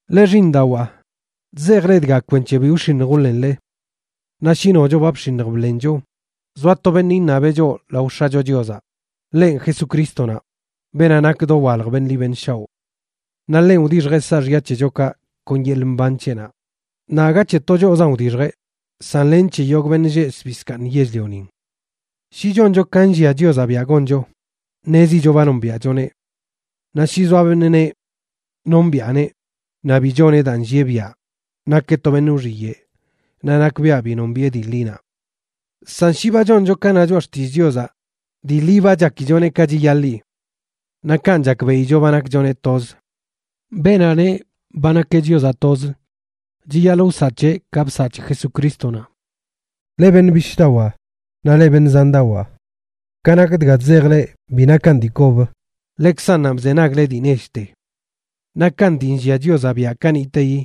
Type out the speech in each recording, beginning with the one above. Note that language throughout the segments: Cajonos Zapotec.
Leꞌ xiiṉdawaa, chzejꞌ leꞌ dga kwenc̱he bi wx̱iṉj wḻenle. Naꞌ shi nocho ba bx̱iṉj bḻencho, zoa to beṉꞌ iṉabeꞌ choꞌ lao X̱acho Chiozaꞌ, ḻenꞌ Jesucrístonaꞌ, beenaꞌ nak dowalj beṉꞌ ḻi beṉꞌ shaoꞌ. Naꞌ ḻenꞌ wdixjeꞌ saaxya c̱hechokaꞌ kon yeḻꞌ mban c̱heꞌnaꞌ, naꞌ aga c̱he to choꞌzan wdixjeꞌ, san len c̱he yogꞌ beṉꞌ lleꞌ zbii zkaaṉ yell-lionin. Shi choncho ka nllia Chiozaꞌ biaꞌ goncho, ṉezicho ba nombiaꞌchoneꞌ. Naꞌ shi zoa beṉꞌ neꞌ: “Nombiꞌaneꞌ”, naꞌ bi choneꞌ daa nllieꞌ biaꞌ, nakeꞌ to beṉꞌ wxiyeꞌ naꞌ nakbiaꞌ bi nombiꞌe dii ḻinaꞌ. San shi ba choncho ka na choꞌa xtillꞌ Chiozaꞌ, dii ḻi ba chakichoneꞌ ka chiyaḻi. Naꞌ kanꞌ chakbeꞌicho ba nakchoneꞌ toz. Beenaꞌ neꞌ ba nakeꞌ Chiozaꞌ tozə chiyaḻꞌ wsaꞌ c̱heꞌ ka bsaꞌ c̱he Jesucrístonaꞌ. Leꞌ beṉꞌ bishꞌdawaa naꞌ leꞌ beṉꞌ zandawaa, ka nak dga chzejꞌ leꞌ bi nakan dii kob, ḻekzannanꞌ bzenagle dii nechte. Nakan dii nllia Chiozaꞌ biaꞌ kaniꞌteyi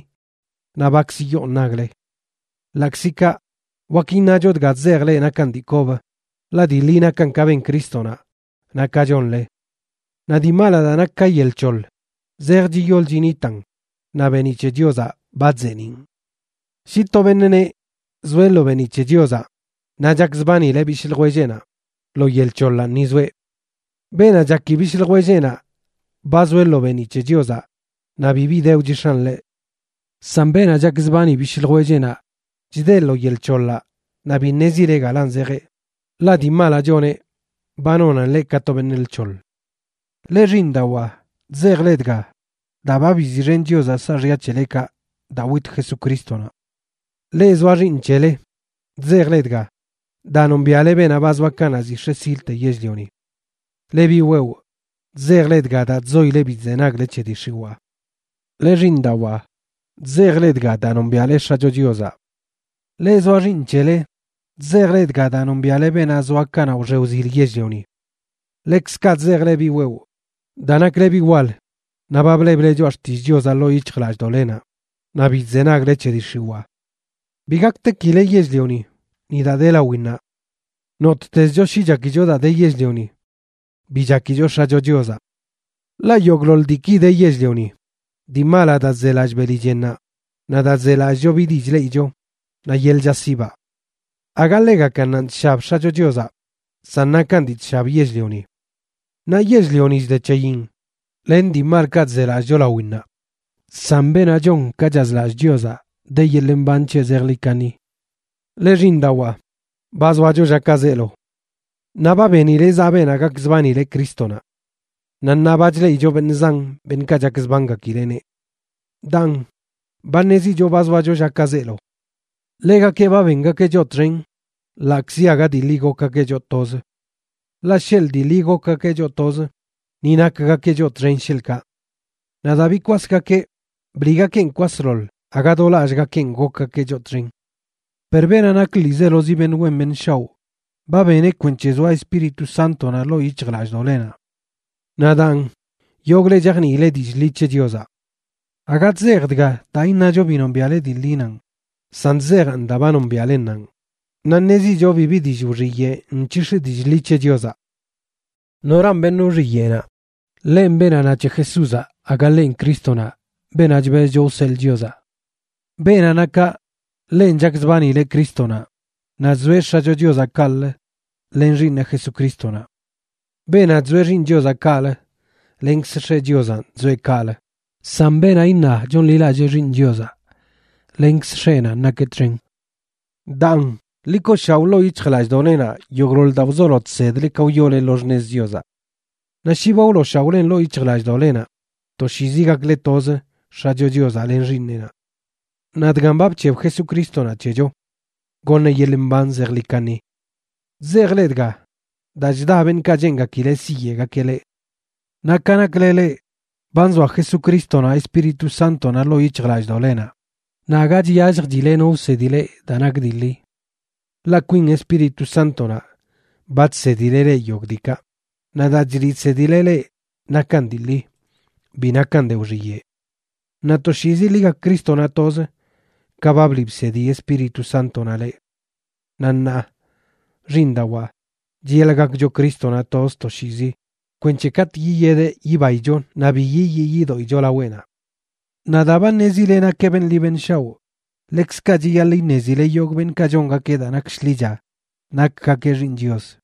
naꞌ bakzə yoon nagle. Ḻaꞌkzi kaꞌ, wak iṉacho dga chzejꞌ leꞌ nakan dii kob, ḻaꞌ dii ḻi nakan ka ben Crístonaꞌ naꞌ ka chonle. Naꞌ dii malaꞌ daa nak ka yel c̱hoḻ zej chiyol chinitan, naꞌ beeniꞌ c̱he Chiozaꞌ ba chzeeniꞌn. Shi to beṉꞌ neꞌ zoeꞌ lo beeniꞌ c̱he Chiozaꞌ, naꞌ chakzbanileꞌ bishꞌ ljwelleꞌnaꞌ, lo yel c̱hoḻanꞌ ni zoeꞌ. Beenaꞌ chaki bishꞌ ljwelleꞌnaꞌ ba zoeꞌ lo beeniꞌ c̱he Chiozaꞌ, naꞌ bibi de wchix̱an ḻeꞌ. San beenaꞌ chakzbani bishꞌ ljwelleꞌnaꞌ chdeꞌ lo yel c̱hoḻaꞌ naꞌ bi ṉezileꞌ galan zejeꞌ, ḻaꞌ dii malaꞌ choneꞌ ba nonan ḻeꞌ ka to beṉꞌ lc̱hoḻ. Leꞌ xiiṉdawaa, chzejꞌ leꞌ dga, daa ba biziꞌxen Chiozaꞌ saaxya c̱helekaꞌ daa wit Jesucrístonaꞌ. Leꞌ zoa xiiṉ c̱hele, chzejꞌ leꞌ dga daa nombiaꞌle beenaꞌ ba zoa kanaꞌ ziꞌ x̱e silte yell-lioni. Leꞌ biꞌ wewꞌ, chzejꞌ leꞌ dga daa chzoile bi chzenagle c̱he dii x̱iwaa. Leꞌ xiiṉdawaa, chzejꞌ leꞌ dga daa nombiaꞌle X̱acho Chiozaꞌ. Leꞌ zoa xiiṉ c̱hele, chzejꞌ leꞌ dga daa nombiaꞌle beenaꞌ zoa kanaꞌ wxe wzil yell-lioni. Ḻekzkaꞌ chzejꞌ leꞌ biꞌ wewꞌ, daa nakle biꞌ wal naꞌ ba bleble Choꞌa Xtillꞌ Chiozaꞌ ḻoo yic̱hjlallꞌdoꞌlenaꞌ, naꞌ bi chzenagle c̱he dii x̱iwaa. Bi gaktekile yell-lioni, ni daa de lawinnaꞌ. Nottezcho shi chakicho daa de yell-lioni, bi chakicho X̱acho Chiozaꞌ. Ḻaꞌ yogꞌḻoḻ diiki de yell-lioni: dii malaꞌ daa chzelallꞌ beli chennaꞌ, naꞌ daa chzelallꞌcho bi dii chleꞌicho, naꞌ yeḻꞌ chaꞌsibaꞌ. Aga ḻegakannanꞌ chshab X̱acho Chiozaꞌ, san nakan dii chshab yell-lioni. Naꞌ yell-lioni chde c̱heyin len dii malkaꞌ chzelallꞌcho lawinnaꞌ, san beenaꞌ chon ka chazlallꞌ Chiozaꞌ de yeḻꞌ mban c̱heꞌ zejḻi kaṉi. Leꞌ, xiiṉdawaa, ba zoacho llakaꞌ zeelo. Naꞌ ba benile zaꞌ Beenaꞌ gakzbanileꞌ Crístonaꞌ.a Naꞌ ṉaa ba chleꞌicho beṉꞌ zan beṉꞌkaꞌ chakzbangakileꞌneꞌ. Daan, ba ṉezicho ba zoacho llakaꞌ zeelo. Ḻegakeꞌ ba bengakeꞌ choꞌ txen ḻaꞌkzi aga dii ḻi gokgakeꞌ choꞌ tozə. Ḻaꞌ sheḻꞌ dii ḻi gokgakeꞌ choꞌ tozə, ni nakgakeꞌ choꞌ txen, sheḻꞌkaꞌ. Naꞌ daa bikwasgakeꞌ, bliꞌgakeꞌn kwasḻoḻ aga do lallꞌgakeꞌn gokgakeꞌ choꞌ txen. Per beenaꞌ nak ḻiizelozi beṉꞌ wen beṉꞌ shaoꞌ ba beneꞌ kwenc̱he zoa Espíritu Sántonaꞌ ḻoo yic̱hjlallꞌdoꞌlenaꞌ. Naꞌ daan, yogꞌle chajniile dillꞌ ḻi c̱he Chiozaꞌ. Aga chzejꞌ dga daa iṉacho bi nombiaꞌle dii ḻinanꞌ, san chzejaꞌn daa ba nombiaꞌlennanꞌ, naꞌ ṉezicho bibi dillꞌ wxiyeꞌ nc̱hix̱ dillꞌ ḻi c̱he Chiozaꞌ. ¿Noran beṉꞌ wxiyeꞌnaꞌ? Ḻenꞌ beenaꞌ na c̱he Jesúzaꞌ aga ḻenꞌ Crístonaꞌ, beenaꞌ chbezcho wseḻꞌ Chiozaꞌ. Beenaꞌ na kaꞌ, ḻenꞌ chakzbanileꞌ Crístonaꞌ, naꞌ chzoeꞌ X̱acho Chiozaꞌ kaꞌlə len Xiiṉeꞌ Jesucrístonaꞌ. Beenaꞌ chzoeꞌ Xiiṉ Chiozaꞌ kaꞌlə lenkz X̱eꞌ Chiozanꞌ chzoeꞌ kaꞌlə. San beenaꞌ iṉa chonḻilallee Xiiṉ Chiozaꞌ, lenkz X̱eꞌnanꞌ nakeꞌ txen. Daan, ḻi kooshaoꞌ ḻoo yic̱hjlallꞌdoꞌlenaꞌ yogꞌḻoḻ daa wzolo chsedle ka wyoole lo xṉez Chiozaꞌ. Naꞌ shi ba wlooshaoꞌlen ḻoo yic̱hjlallꞌdoꞌlenaꞌ, toshiizi gakle tozə X̱acho Chiozaꞌ len Xiiṉeꞌnaꞌ. Naꞌ dgan ba bc̱heb Jesucrístonaꞌ c̱hecho: goṉeꞌ yeḻꞌ mban zejḻi kaṉi. Chzejꞌ leꞌ dga, daa chda beṉꞌkaꞌ cheengakileꞌ siyeꞌgakeꞌ leꞌ. Naꞌ ka nakle leꞌ, ba nzoa Jesucrístonaꞌ Espíritu Sántonaꞌ ḻoo yic̱hjlallꞌdoꞌlenaꞌ, naꞌ aga chyalljchile no wsedi leꞌ daa nak dii ḻi. Ḻaꞌ kwin Espíritu Sántonaꞌ ba chsedileꞌ leꞌ yogꞌ diikaꞌ, naꞌ daa chliꞌ chsedileꞌ leꞌ nakan dii ḻi, bi nakan de wxiyeꞌ. Naꞌ toshiizi ḻi gak Crístonaꞌ tozə, ka ba bliꞌ bsedi Espíritu Sántonaꞌ leꞌ. Naꞌ ṉaa, xiiṉdawaa, chiyaḻꞌ gakcho Crístonaꞌ toz toshiizi kwenc̱he katꞌ yiyedeꞌ yibaicho naꞌ bi yiyii yidoꞌicho laweꞌnaꞌ. Naꞌ daa ba ṉezile nakeꞌ beṉꞌ ḻi beṉꞌ shao, ḻekzkaꞌ chiyaḻꞌ iṉezile yogꞌ beṉꞌkaꞌ chongakeꞌ daa nak shḻicha nakgakeꞌ xiiṉ Chios.